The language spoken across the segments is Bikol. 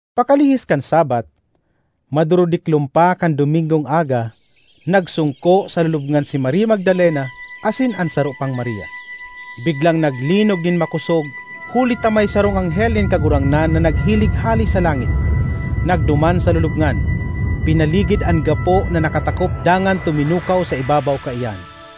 Pakalihis kan Sabbath, madurudiklom pa kan Domingong aga, nagsongko sa lulubngan si Maria Magdalena asin an saro pang Maria. Biglang naglinog nin makosog huli ta may sarong anghel nin Kagurangnan na naghilig hale sa langit, nagduman sa lulubngan, pinaligid an gapo na nakatakop dangan tuminukaw sa ibabaw kaiyan.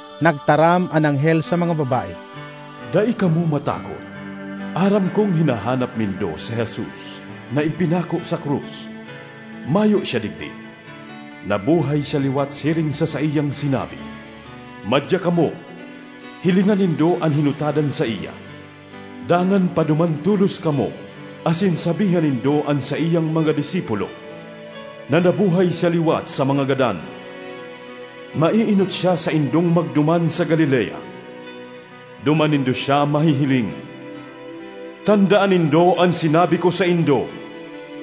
Nagtaram an anghel sa mga babae, “Dai kamo matakot. Aram kong hinahanap nindo si Jesus na ipinako sa krus. Mayo siya digdi; nabuhay siya liwat siring sa saiyang sinabi. Madya kamo, hilinga nindo an hinutadan saiya. Dangan paduman tolos kamo asin sabihan nindo an saiyang mga disipulo na, ‘Nabuhay siya liwat sa mga gadan; maeenot siya saindong magduman sa Galilea. Duman nindo siya mahihiling!’ Tandaan nindo an sinabi ko saindo.”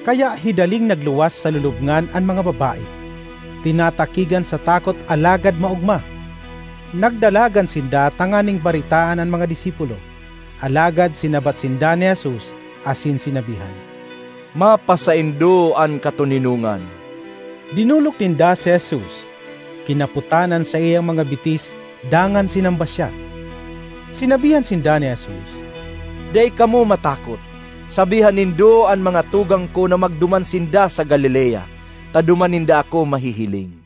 Kaya hidaling nagluwas sa lulubngan an mga babae, tinatakigan sa takot alagad maogma; nagdalagan sinda tanganing baretaan an mga disipulo. Alagad sinabat sinda ni Jesus asin sinabihan, “Mapasaindo an katoninongan.” Dinolok ninda si Jesus, kinapotan an saiyang mga bitis dangan sinamba siya. Sinabihan sinda ni Jesus, “Dai kamo matakot. Sabihan nindo an mga tugang ko na magduman sinda sa Galilea, ta duman ninda ako mahihiling.”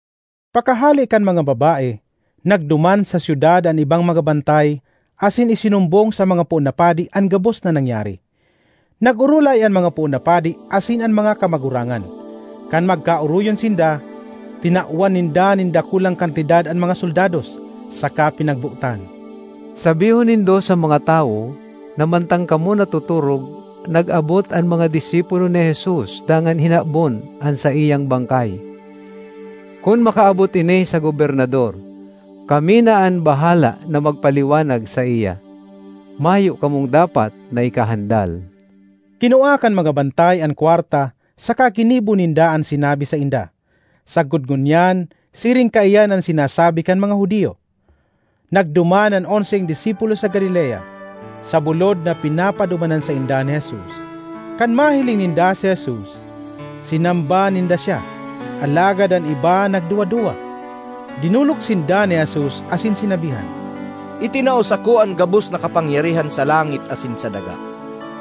Pakahale kan mga babae, nagduman sa syudad an ibang mga bantay asin isinumbong sa mga poon na padi an gabos na nangyari. Nag-orolay an mga poon na padi asin an mga kamagurangan; kan magkaoroyon sinda, tinawan ninda nin dakulang kantidad an mga soldados saka pinagbotan, “Sabihon nindo sa mga tawo na mantang kamo natotorog, nag-abot an mga disipulo ni Jesus dangan hinabon an saiyang bangkay. Kun makaabot ini sa Gobernador, kami na an bahala na magpaliwanag saiya. Mayo kamong dapat na ikahandal.” Kinua kan mga bantay an kwarta saka ginibo ninda an sinabi sainda. Sagkod ngunyan siring kaiyan an sinasabi kan mga Judio. Nagduman an onseng disipulo sa Galilea, sa bulod na pinapadumanan sainda ni Jesus. Kan mahiling ninda si Jesus, sinamba ninda siya, alagad an iba nagduwa-duwa. Dinolok sinda ni Jesus asin sinabihan, “Itinao sako an gabos na kapangyarihan sa langit asin sa daga.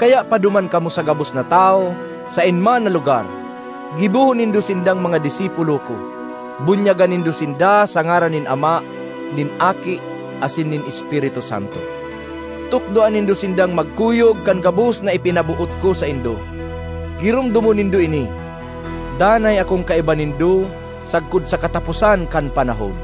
Kaya paduman kamo sa gabos na tawo saen man na lugar; gibohon nindo sindang mga disipulo ko. Bunyagan nindo sinda sa ngaran nin Ama, nin Aki, asin nin Espiritu Santo. Tukdoan nindo sindang magkuyog kan gabos na ipinaboot ko saindo. Giromdomon nindo ini: danay akong kaiba nindo sagkod sa kataposan kan panahon.”